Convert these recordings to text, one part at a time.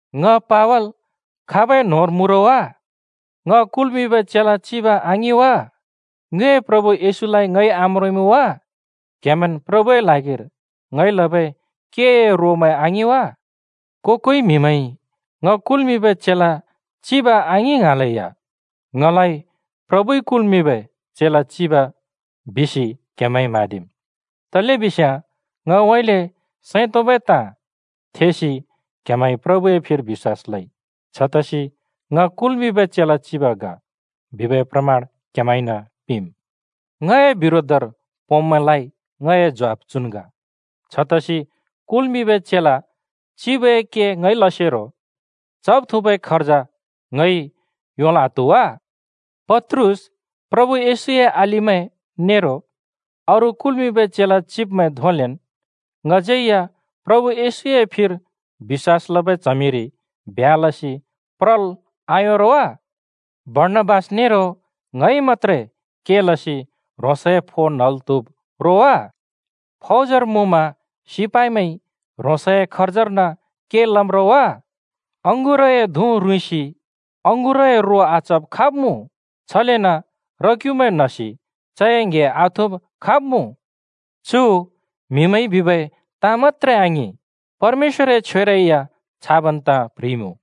ङ पावल खाबै न्होंर मुँ रो वा? ङ कुल्मिंबै चेला चिब आङिं वा? ङ्योए प्रभु येशूलाइ ङइ आम्रोंइमुँ वा? क्हेमैंन् प्रभुए ल्हागिर ङइ लबै केए रोमैं आङिं वा? को-कोइ म्‍हिमैंइ ङ कुल्मिंबै चेला चिब आङिं ङ्हाँलेया ङलाइ प्रभुइ कुल्मिंबै चेला चिब बिसि क्‍हेमैंइ म्हाँदिम्। तलेबिस्याँ ङउँइँले सैं तोंबै ताँ थेसि क्‍हेमैंइ प्रभुए फिर बिश्‍वास लइ छतसि “ङ कुल्मिंबै चेला चिब ग” बिबै प्रमाण क्हेमैंन पिंम्! ङए बिरोधर पोंब्मैंलाइ ङए ज्वाफ चुन् ग। छतसि कुल्मिंबै चेला चिबए के ङइ लसेरो चब् थुँबै खर्ज ङइ योंल् आत्हु वा? पत्रुस, प्रभु येशूए अलिमैं नेरो अरू कुल्मिंबै चेला चिब्मैं धोंलेन् ङज्यै या प्रभु येशूए फिर बिश्‍वास लबै च्हमिरि ब्ह्‍या लसि प्रल् आयों रो वा? बर्णाबास नेरो ङइ मत्‍त्रे के लसि ह्रोंसए फो न्हल् त्हुब् रो वा? फौजर मुँमा सिपाइमैंइ ह्रोंसए खर्जर्न के लम् रो वा? अँगुरए धुँ रुँइँसि अँगुरए रो आचब खाब मुँ? छलेन र-क्‍युमैं न्हसि चए ङ्‍हे आथुँब खाब् मुँ? चु म्हिमैंइ बिबै ताँ मत्‍त्रे आङिं, परमेश्‍वरए छ्वेरै या छाबन् ताँ प्ह्रिइमुँ।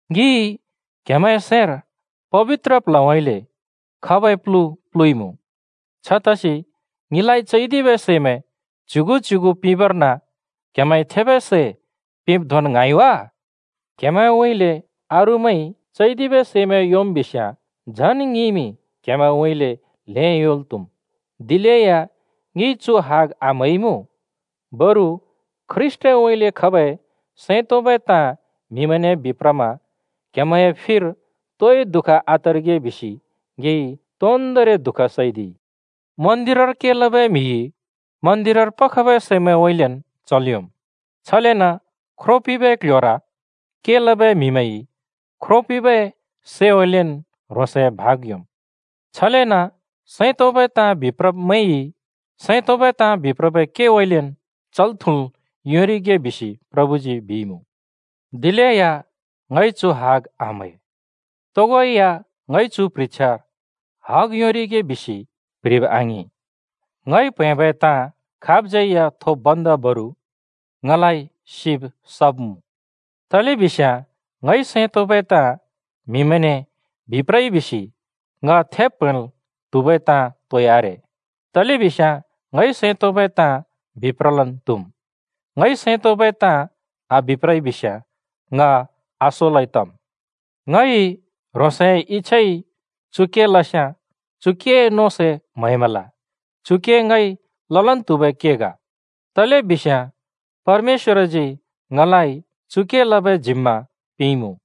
ङिइ क्‍हेमैंए सैंर पबित्र प्ल्हउँइँले खबै प्‍लु प्‍लुइमुँ। छतसि ङिलाइ चैदिबै सैमैं च्युगु-च्युगु पिंबर्न क्हेमैंइ थेबै सै पिंब् धोंन् ङ्हाँइ वा? क्‍हेमैंउँइँले अरूमैंइ चैदिबै सैमैं योंम् बिस्याँ, झन् ङिइमि क्‍हेमैंउँइँले ल्हें योंल् त्हुम्। दिलेया ङिइ चु हग आम्हैइमुँ। बरु ख्रीष्‍टउँइँले खबै सैं तोंबै ताँ म्हिमैंने बिप्रमा क्‍हेमैंए फिर तोइ दुःख आतरिगे बिसि ङिइ तोन्दोंरि दुःख सैदिइ। मन्दिरर के लबै म्‍हिइ मन्दिरर खबै सैमैंउँइँलेन् चल् योंम्, छलेन ख्रो पिंबै क्ल्ह्‍योर के लबै म्‍हिमैंइ ख्रो पिंबै सैउँइँलेन् ह्रोंसए भाग योंम्। छलेन सैं तोंबै ताँ बिप्रब्‍मैंइ सैं तोंबै ताँ बिप्रबै केउँइँलेन् चल्-थुँल् योंरिगे बिसि प्रभुजी बिइमुँ। दिलेया ङइ चु हग आम्है। तोगो या ङइ चु प्ह्रिछ्या हग योंरिगे बिसि प्ह्रिब् आङिं। ङइ प्हैंबै ताँ खाबज्यै या थोब् भन्दा बरु ङलाइ सिब सब् मुँ! तलेबिस्याँ ङइ सैं तोंबै ताँ म्हिमैंने बिप्रइ बिसि ङ थेब् प्‍हैंल् त्हुबै ताँ तोइ आरे। तलेबिस्याँ ङइ सैं तोंबै ताँ बिप्रलन् त्हुम्। ङइ सैं तोंबै ताँ आबिप्रइ बिस्‍याँ ङ आसोलै तम्। ङइ ह्रोंसए इच्छाइ चु के लस्याँ चु केए नों सै म्हैमल। बरु चु के ङइ ललन् त्हुबै के ग, तलेबिस्याँ परमेश्‍वरजी ङलाइ चु के लबै जिम्‍मा पिंइमुँ।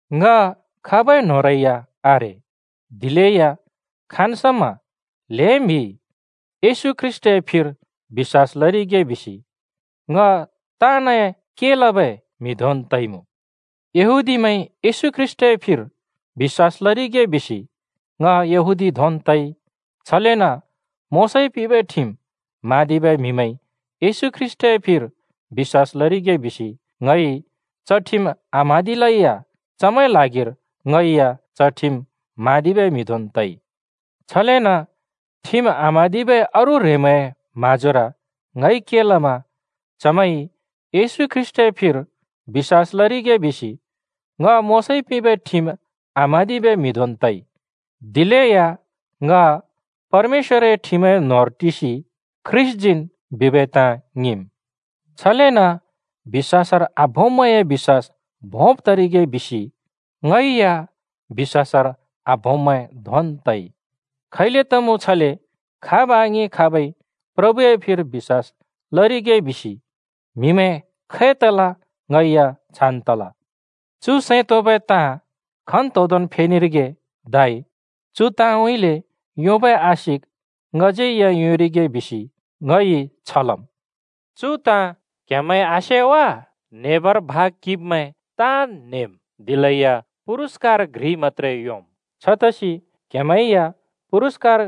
ङ खाबै न्होंरै या आरे, दिलेया खाँन् समा ल्हें म्हिइ येशू ख्रीष्‍टए फिर बिश्‍वास लरिगे बिसि ङ ताँनए के लबै म्हि धोंन् तइमुँ। यहूदीमैंइ येशू ख्रीष्‍टए फिर बिश्‍वास लरिगे बिसि ङ यहूदी धोंन् तइ। छलेन मोशाइ पिंबै ठिम (नियम) म्हाँदिबै म्हिमैंइ येशू ख्रीष्‍टए फिर बिश्‍वास लरिगे बिसि ङइ च ठिम आम्हाँदिलै या चमैंए ल्हागिर ङै या च ठिम म्हाँदिबै म्हि धोंन् तइ। छलेन ठिम आम्हाँदिबै अरू ह्रेंमैंए म्हाँजोर ङइ के लमा चमैंइ येशू ख्रीष्‍टए फिर बिश्‍वास लरिगे बिसि ङ मोशाइ पिंबै ठिम आम्हाँदिबै म्हि धोंन् तइ। (दिलेया ङ परमेश्‍वरए ठिमए न्होंर टिसि ख्रीष्‍टजीन् बिबै ताँ ङिंम्।) छलेन बिश्‍वासर आभोंब्मैंए बिश्‍वास भोंब् तरिगे बिसि ङै या बिश्‍वासर आभोंब्मैं धोंन् तइ। खैले तमुँ छले खाब् आङिं खाबइ प्रभुए फिर बिश्‍वास लरिगे बिसि म्हिमैं खै तल ङै या छान् तल। चु सैं तोंबै ताँ खन्तोंदोंन् फेनेरिगे धै चु ताँउँइँले योंबै आशिक ङज्यै या योंरिगे बिसि ङइ छ लम्। चु ताँ क्‍हेमैंज्यै सेइमुँ: न्हेबर भाग किंब्मैं ताँन् न्हेम्, दिलेया पुरस्‍कार घ्रिइ मत्‍त्रे योंम्। छतसि क्हेमैं या पुरस्‍कार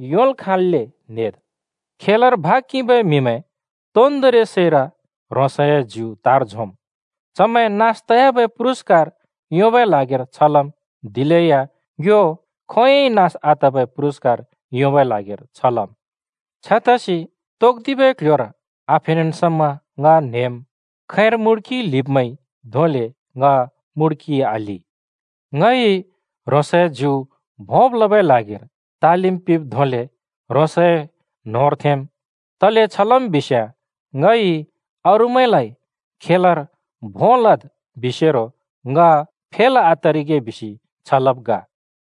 योंल् खाँल्‍ले न्हेद्। खेलर भाग किंबै म्हिमैं तोन्दोंरि सैर ह्रोंसए ज्यु तार झोंम्। चमैं नास तयाबै पुरस्‍कार योंबै ल्हागिर छ लम्, दिलेया ङ्यो खोंयोंइ नास आतबै पुरस्कार योंबै ल्हागिर छ लम्। छतसि तोक्‍दिबै क्‍ल्‍ह्‍योर आफेनेन् समा ङ न्हेम्। खैंर मुड्किइ ल्हिब्मैंइ धोंले ङ मुड्किइ आल्हि। ङइ ह्रोंसए ज्यु भोंब् लबै ल्हागिर तालिम पिंब् धोंले ह्रोंसए न्होंर थेंम्। तले छ लम् बिस्‍याँ ङइ अरूमैंलाइ “खेलर भों लद्” बिसेरो ङ फेल आतरिगे बिसि छ लब् ग।